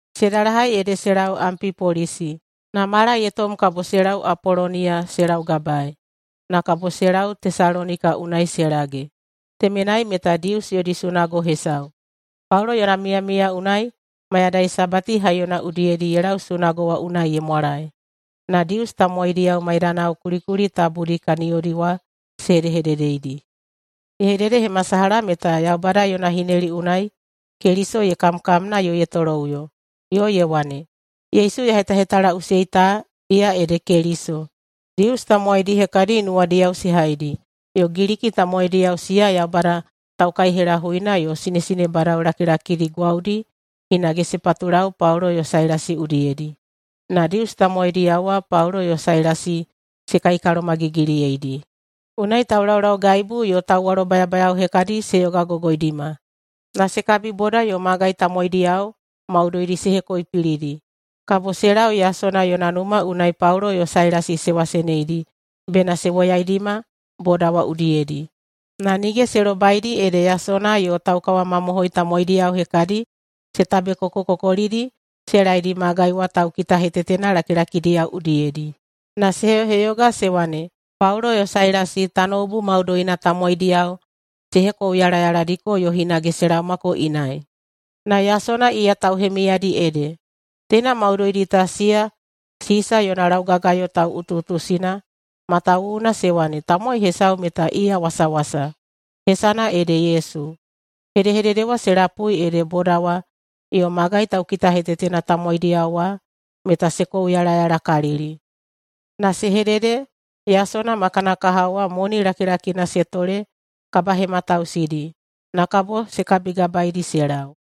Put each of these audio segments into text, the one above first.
Se dalahai ede se lau Ampipolisi. Na mala ye tom kabo se lau Apoloniya se laugabae, na kabo se lau Tesalonika unai se lage. Temenai meta Dius yodi sunago hesau. Paulo yona miyamiya unai mayadai Sabati haiyona udiyedi ye lau sunago wa unai ye mwalae, na Dius tamowaidiyao maidanao kulikuli tabudi kaniyodi wa se hedehededeidi. Ye hededehemasalaha meta Yaubada yona hineli unai Keliso ye kamkamna yo ye toloꞌuyo, yo ye wane, “Yesu ya hetahetalaꞌusei ta, iya ede Keliso.” Dius tamowaidi hekadi nuwadiyao se haidi, yo Giliki tamowaidiyao siya Yaubada taukaihelahuina yo sinesinebadao lakilakidi gwaudi hinage se patulau Paulo yo Sailasi udiyedi. Na Dius tamowaidiyao wa Paulo yo Sailasi se kaikalomagigiliyeidi. Unai taulaulaugaibu yo tauwalobayabayao hekadi se yogagogoidima, na se kabiboda yo magai tamowaidiyao maudoidi se hekoipilidi. Kabo se lau Yasona yona numa unai Paulo yo Sailasi se waseneidi bena se woyaidima boda wa udiyedi. Na nige se lobaidi ede Yasona yo taukawamamohoi tamowaidiyao hekadi se tabekokokokolidi se laedi magai wa taukitahetetena lakilakidiyao udiyedi, na se heyoheyoga se wane, “Paulo yo Sailasi tanoubu maudoina tamowaidiyao se hekouyalayaladiko yo hinage se laomako inai, na Yasona iya tauhemiyadi ede. Teina maudoidi ta siya Sisa yona laugagayo tauꞌutuꞌutusina matawuwuna se wane tamowai hesau meta iya wasawasa, hesana ede Yesu.” Hedehedede wa se lapui ede boda wa yo magai taukitahetetena tamowaidiyao wa meta se kouyalayalakalili na se hedede Yasona ma kana kahao wa moni lakilakina se tole kabahematausidi, na kabo se kabigabaedi se lau.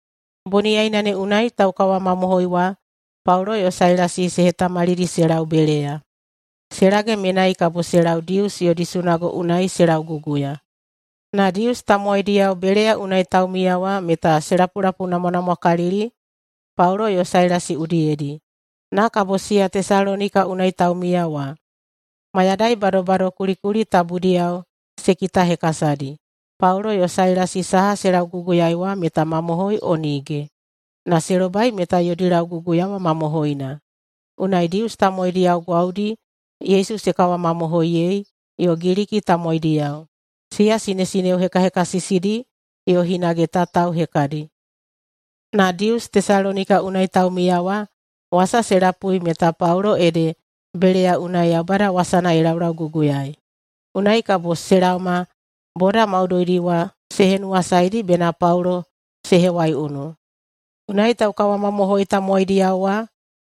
Boniyaina ne unai taukawamamohoi wa Paulo yo Sailasi se hetamalidi se lau Beleya. Se lage menai kabo se lau Dius yodi sunago unai se lauguguya. Na Dius tamowaidiyao Beleya unai taumiya wa meta se lapulapuinamwanamwakalili Paulo yo Sailasi udiyedi, na kabo siya Tesalonika unai taumiya wa. Mayadai badobado kulikuli tabudiyao se kitahekasadi, Paulo yo Sailasi saha se lauguguyaei wa meta mamohoi o nige. Na se lobai meta yodi lauguguya wa mamohoina, unai Dius tamowaidiyao gwaudi Yesu se kawamamohoiyei, yo Giliki tamowaidiyao, siya sinesineo hekahekasisidi yo hinage tatao hekadi. Na Dius Tesalonika unai taumiya wa wasa se lapui meta Paulo ede Beleya unai Yaubada wasana ye laulauguguyaei. Unai kabo se laoma boda maudoidi wa se henuwasaedi bena Paulo se hewaiunu. Unai taukawamamohoi tamowaidiyao wa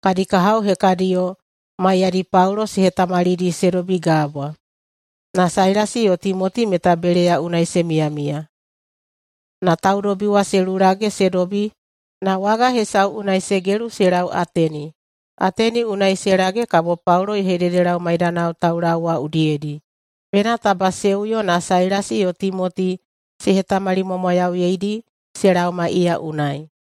kadi kahao hekadiyo maiyadi Paulo se hetamalidi se dobi gabwa. Na Sailasi yo Timoti meta Beleya unai se miyamiya. Na taudobi wa se lulage se dobi na waga hesau unai se gelu se lau Ateni. Ateni unai se lage kabo Paulo ye hededelau maidanao taulau wa udiyedi bena taba se uyo na Sailasi yo Timoti se hetamalimwamwayauyeidi se laoma iya unai.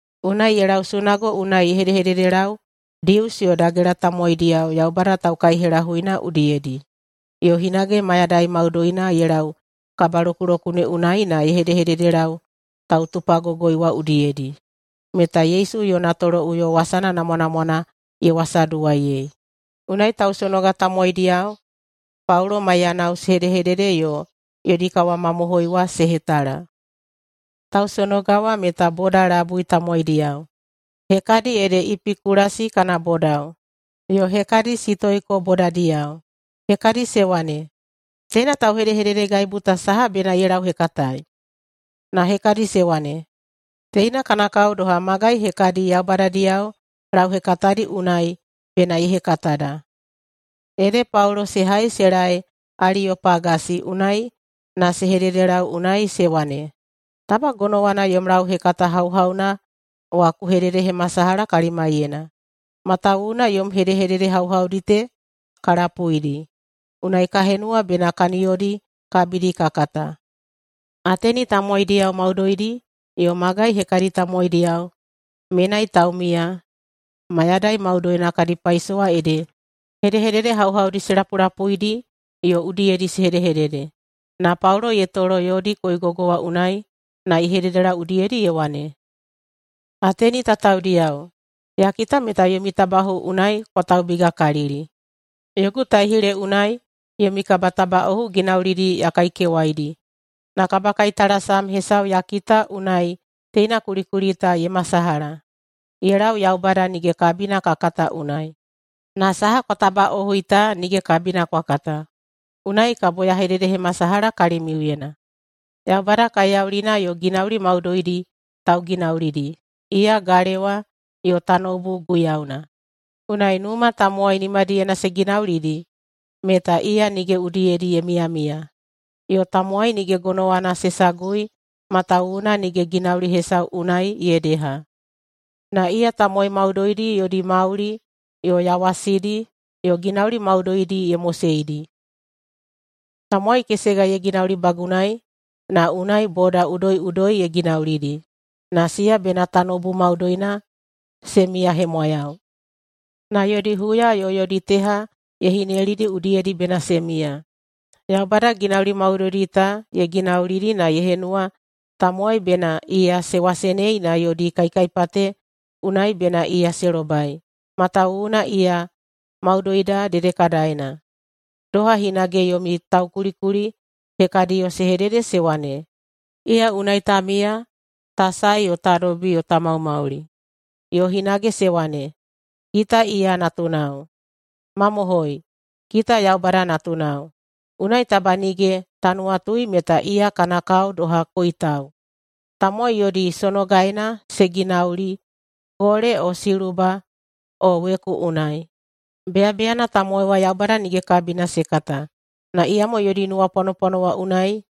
Unai ye lau sunago unai ye hedehededelau Dius yo dagela tamowaidiyao Yaubada taukaihelahuina udiyedi. Yo hinage mayadai maudoina ye lau kabalokulokune unai na ye hedehededelau tautupagogoi wa udiyedi, meta Yesu yo yona toloꞌuyo wasana namwanamwana ye wasaduwaiyei. Unai tausonoga tamowaidiyao Paulo maiyanao se hedehedede yo yodi kawamamohoi wa se hetala. Tausonoga wa meta boda labui tamowaidiyao. Hekadi ede Epikulasi kana bodao, yo hekadi Sitoiko bodadiyao. Hekadi se wane, “Teina tauhedehededegaibu ta saha bena ye lauhekataei?” Na hekadi se wane, “Teina kana kao doha magai hekadi yaubadadiyao lauhekatadi unai bena ye hekatada.” Ede Paulo se hai se laei Aliyopagasi unai na se hededelau unai se wane, “Taba gonowana yom lauhekata hauhauna wa ku hededehemasalaha kalimaiyena. Matawuwuna yom hedehedede hauhaudi te ka lapuidi, unai ka henuwa bena kaniyodi kabidi ka kata.” Ateni tamowaidiyao maudoidi yo magai hekadi tamowaidiyao menai taumiya mayadai maudoina kadi paisowa ede hedehedede hauhaudi se lapulapuidi yo udiyedi se hedehedede. Na Paulo ye tolo yodi koigogo wa unai na ye hededelau udiyedi ye wane, “Ateni tataodiyao! Ya kita meta yomi tabaꞌohu unai kwa taubigakalili. Yogu taihile unai yomi kabatabaꞌohu ginaulidi ya kaikewaidi na kabakaitalasam hesau ya kita unai teina kulikuli ta ye masalaha: YE LAU YAUBADA NIGE KABINA KA KATA UNAI. Na saha kwa tabaꞌohui ta nige kabina kwa kata, unai kabo ya hededehemasalaha kalimiuyena. Yaubada kaiyaulina yo ginauli maudoidi tauginaulidi, iya galewa yo tanoubu Guiyauna. Unai numa tamowai nimadiyena se ginaulidi, meta iya nige udiyedi ye miyamiya. Yo tamowai nige gonowana se sagui matawuwuna nige ginauli hesau unai ye deha, na iya tamowai maudoidi yodi mauli yo yawasidi yo ginauli maudoidi ye moseidi. Tamowai kesega ye ginaulibagunai, na unai boda udoiꞌudoi ye ginaulidi, na siya bena tanoubu maudoina se miyahemwayau. Na yodi huya yo yodi teha ye hinelidi udiyedi bena se miya. Yaubada ginauli maudoidi ta ye ginaulidi na ye henuwa tamowai bena iya se wasenei na yodi kaikaipate unai bena iya se lobai, matawuwuna iya maudoida dedekadaena. Doha hinage yomi taukulikuli hekadiyo se hedede se wane, ‘Iya unai ta miya, ta sae yo ta dobi yo ta maumauli.’ Yo hinage se wane, ‘Kita iya natunao.’ Mamohoi, kita Yaubada natunao. Unai taba nige ta nuwatui meta iya kana kao doha koitau, tamowai yodi sonogaena se ginauli gole o siluba o weku unai. Beyabeyana tamowai wa Yaubada nige kabina se kata na iyamo yodi nuwapwanopwano wa unai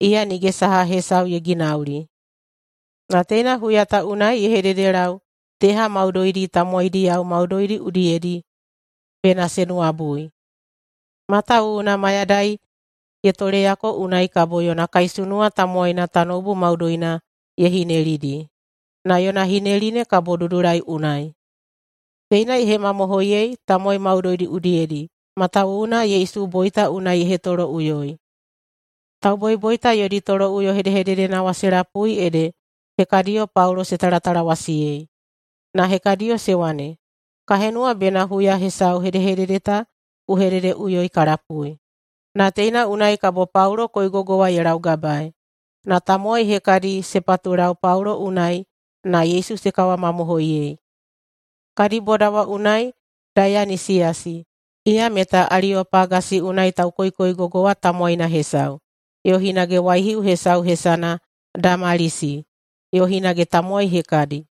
iya nige saha hesau ye ginauli. Na teina huya ta unai ye hededelau teha maudoidi tamowaidiyao maudoidi udiyedi bena se nuwabui. Matawuwuna mayadai ye toleyako unai kabo yona kaisunuwa tamowaina tanoubu maudoina ye hinelidi, na yona hineli ne kabo dudulai unai. Teina ye hemamohoiyei tamowai maudoidi udiyedi matawuwuna Yesu boita unai ye hetoloꞌuyoi.” Tauboiboita yodi toloꞌuyo hedehededena wa se lapui ede hekadiyo Paulo se talatalawasiyei, na hekadiyo se wane, “Ka henuwa bena huya hesau hedehedede ta ku hededeꞌuyoi ka lapui.” Na teina unai kabo Paulo koigogo wa ye laugabaei. Na tamowai hekadi se patulau Paulo unai na Yesu se kawamamohoiyei. Kadi boda wa unai Daiyanisiyasi, iya meta Aliyopagasi unai taukoikoigogo wa tamowaina hesau, yo hinage waihiu hesau hesana Damalisi, yo hinage tamowai hekadi.